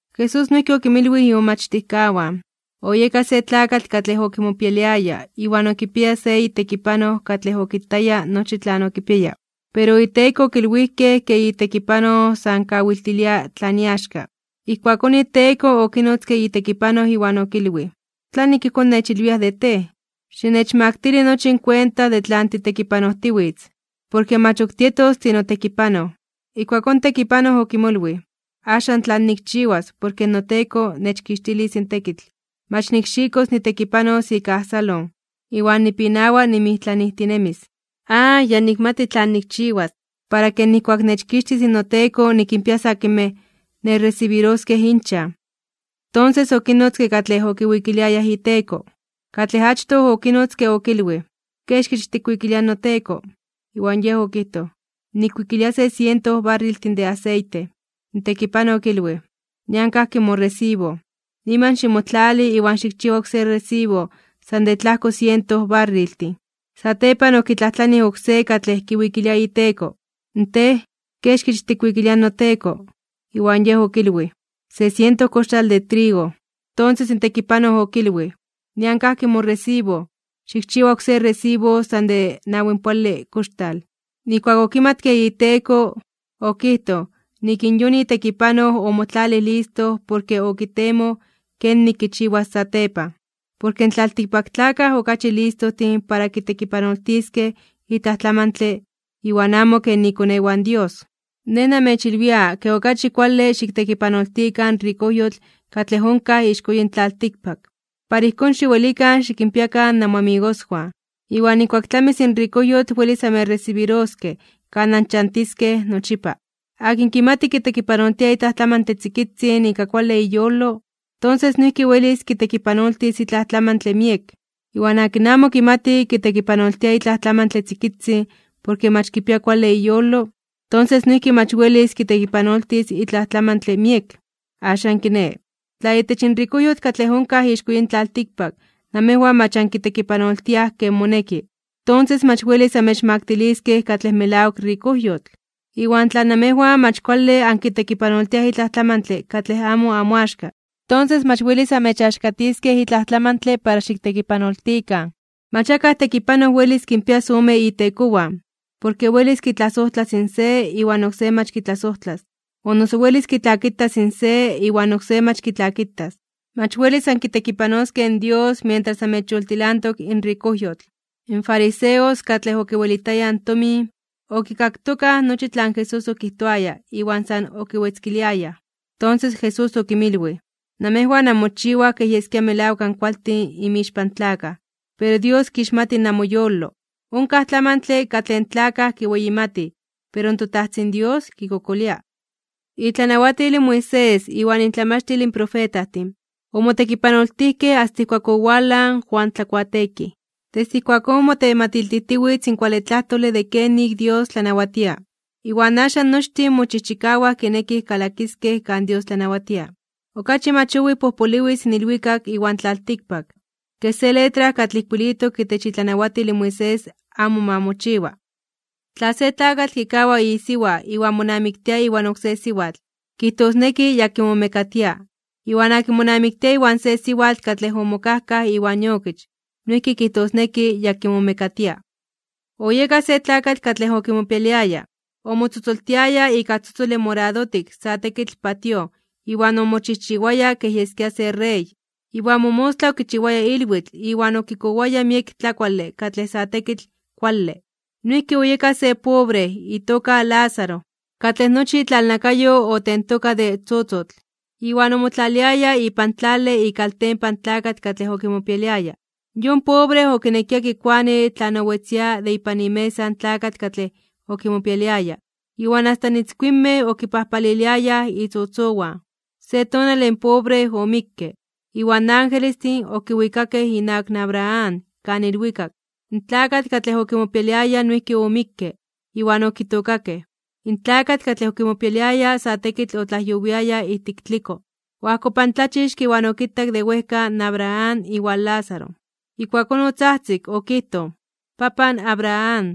Jesús noijki okinmilwij imomachtijkawan: ―Oyeka se tlakatl katlej okimopialiaya iwan okipiaya se itekipanoj katlej okitaya nochi tlan okipiaya. Pero iteko okilwijkej ke itekipanoj san kawiltilia tlan iaxka. Ijkuakón iteko okinotzke itekipanoj iwan okilwij: “¿Tlanik ijkón nechilwiaj de tej? Xinechmaktili nochi in kuenta de tlan titekipanojtiwitz, porke mach ok tietos tinotekipanoj.” Ijkuakón in tekipanoj okimolwij: “¿Axan tlan nikchiwas porke noteko nechkixtilis in tekitl? Mach nikxikos nitekipanos ika ajsalon, iwan nipinawa nimijtlanijtinemis. Ya nikmati tlan nikchiwas, para ke nijkuak nechkixtis noteko nikinpias akinmej nechresibiroskej inchan.” Tonses okinnotzke katlej okiwikiliayaj iteko. Katlej achtoj okinotzke okilwij: “¿Kexkich tikwikilia in noteko?” Iwan yej okijtoj: “Nikwikilia se siento barriltin de aseite.” In tekipanoj okilwij: “Nian kajki moresibo. Niman ximotlali iwan xikchiwa oksé resibo san de tlajko siento barriltin.” Satepan okitlajtlanij oksé katlej kiwikilia iteko: “Tej, ¿kexkich tikwikilia in noteko?” Iwan yej okilwij: “Se siento koxtal de trigo.” Tonses in tekipanoj okilwij: “Nian kajki moresibo. Xikchiwa oksé resibo san de nawinpoale koxtal.” Nijkuak okimatke iteko, okijtoj nik in yon itekipanoj omotlalij listo porke okitemoj kenik kichiwas satepan. Porke in tlaltikpaktlakaj okachi listojtin para kitekipanoltiskej itlaj tlamantle iwan amo ken ikonewan Dios. ’Nej namechilwia ke okachi kuale xiktekipanoltikan in rikojyotl katlej onkaj ixko yin tlaltikpak, para ijkón xiwelikan xikinpiakan namoamigoswan, iwan nijkuak tlamis in rikojyotl welis amechresibiroskej kan anchantiskej nochipa. ’Akin kimati kitekipanoltia itlaj tlamantle tzikitzin ika kuale iyolo, tonses noijki welis kitekipanoltis itlaj tlamantle miek. Iwan akin amo kimati kitekipanoltia itlaj tlamantle tzikitzin porke mach kipia kuale iyolo, tonses noijki mach welis kitekipanoltis itlaj tlamantle miek. Axan kiné, tla itech in rikojyotl katlej onkaj ixko yin tlaltikpak namejwan mach ankitekipanoltiaj ken moneki, tonses mach welis amechmaktiliskej katlej melawak rikojyotl. Iwan tla namejwan mach kuale ankitekipanoltiaj itlaj tlamantle katlej amo amoaxka, tonses mach welis amechaxkatiskej itlaj tlamantle para xiktekipanoltikan. ’Mach akaj tekipanoj welis kinpias ome itekowan, porke welis kitlasojtlas in se iwan oksé mach kitlasojtlas, o noso welis kitlakitas in se iwan oksé mach kitlakitas. Mach welis ankitekipanoskej in Dios mientras amechyoltilantok in rikojyotl. In fariseos katlej okiwelitayaj tomin, okikaktokaj nochi tlan Jesús okijtoaya iwan san okiwetzkiliayaj. Tonses Jesús okinmilwij: ―Namejwan anmochiwaj ke yeskia melawak ankualtin inmixpan tlakaj, pero Dios kixmati namoyolo. Onkaj tlamantle katlej in tlakaj kiweyimatij, pero toTajtzin Dios kikokolia. ’Itlanawatil in Moisés iwan intlamachtil in profetajtin omotekipanoltijkej asta ijkuak owalaj in Juan Tlakuateekij. Desde ijkuakón motematiltijtiwitz in kuale tlajtole de kenik Dios tlanawatia. Iwan axan nochtin mochijchikawaj kinekij kalakiskej kan Dios tlanawatia. ’Okachi mach owij pojpoliwis in ilwikak iwan tlaltikpak, ke se letra katlej ijkuilitok itech itlanawatil in Moisés amo ma mochiwa. ’Tla se tlakatl kikawa isiwa iwan monamiktia iwan oksé siwatl, kijtosneki ya kimomekatia. Iwan akin monamiktia iwan se siwatl katlej omokajkaj iwan iokich, noijki kijtosneki ya kimomekatia. ’Oyeka se tlakatl katlej okimopialiaya. Omotzotzoltiaya ika tzotzole moradotik sa tekitl patíoj iwan omochijchiwaya kej yeskia se rey. Iwan momostla okichiwaya ilwitl iwan okikowaya miek tlakuale katlej sa tekitl kuale. Noijki oyeka se pobre itoka Lázaro, katlej nochi itlalnakayo otentoka de tzotzotl. Iwan omotlaliaya ipan tlale ikaltempan in tlakatl katlej okimopialiaya. Yon pobre okinekia kikuani tlan owetzia de ipan imesa in tlakatl katlej okimopialiaya. Iwan asta in itzkuinmej okipajpaliliayaj itzotzowan. Se tonale in pobre omikke, iwan angelestin okiwikakej inawak Abraham kan ilwikak. In tlakatl katlej okimopialiaya noijki omikke, iwan okitookakej. In tlakatl katlej okimopialiaya sa tekitl otlajyowiaya ijtik tliko, oajkopantlachixke iwan okitak de wejka in Abraham iwan Lázaro. Ijkuakón otzajtzik okijtoj: “Papan Abraham,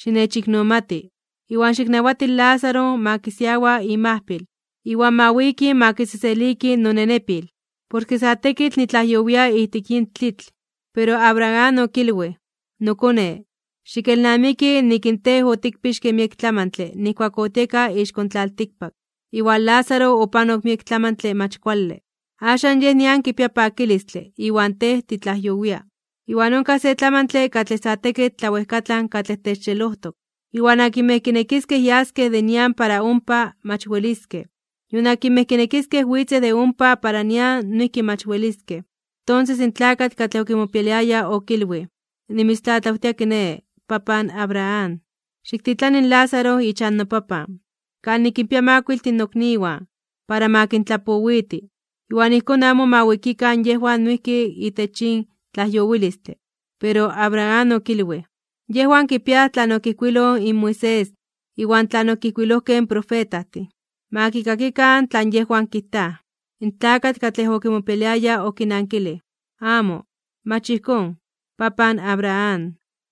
xinechiknomati, iwan xiknawati in Lázaro ma kisiawa imajpil, iwan ma wiki ma kiseseliki nonenepil. Porke sa tekitl nitlajyowia ijtik yin tlitl.” Pero Abraham okilwij: “Nokone, xikelnamiki nik in tej otikpixke miek tlamantle nijkuak otinemia ixko in tlaltikpak, iwan Lázaro opanok miek tlamantle mach kuale. Axan yej nian kipia pakilistle, iwan tej titlajyowia. Iwan onkaj se tlamantle katlej sa tekitl tlawejkatlan katlej techxelojtok. Iwan akinmej kinekiskej yaskej de nian para ompa, mach weliskej, nion akinmej kinekiskej witzej de ompa para nian noijki mach weliskej.” Tonses in tlakatl katlej okimopialiaya okilwij: “Nimitztlatlawtia kiné, papan Abraham, xiktitlani in Lázaro ichan nopapan, kan nikinpia makuiltin nokniwan, para ma kintlapowiti, iwan ijkón amo ma wikikan yejwan noijki itech yin tlajyowilistle.” Pero Abraham okilwij: “Yejwan kipiaj tlan okijkuiloj in Moisés iwan tlan okijkuilojkej in profetajtin. Ma kikakikan tlan yejwan kijtaj.” In tlakatl katlej okimopialiaya okinankilij: “Amo, mach ijkón, papan Abraham,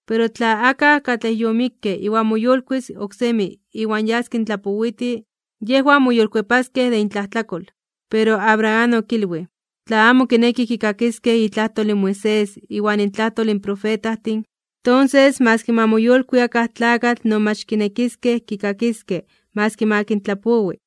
pero tla akaj katlej yomikke iwan moyolkuis (moyolitis) oksemi iwan yas kintlapowiti, yejwan moyolkuepaskej de intlajtlakol.” Pero Abraham okilwij: “Tla amo kinekij kikakiskej itlajtol in Moisés iwan intlajtol in profetajtin, tonses maski ma moyolkui akaj tlakatl no mach kinekiskej kikakiskej maski ma kintlapowi.”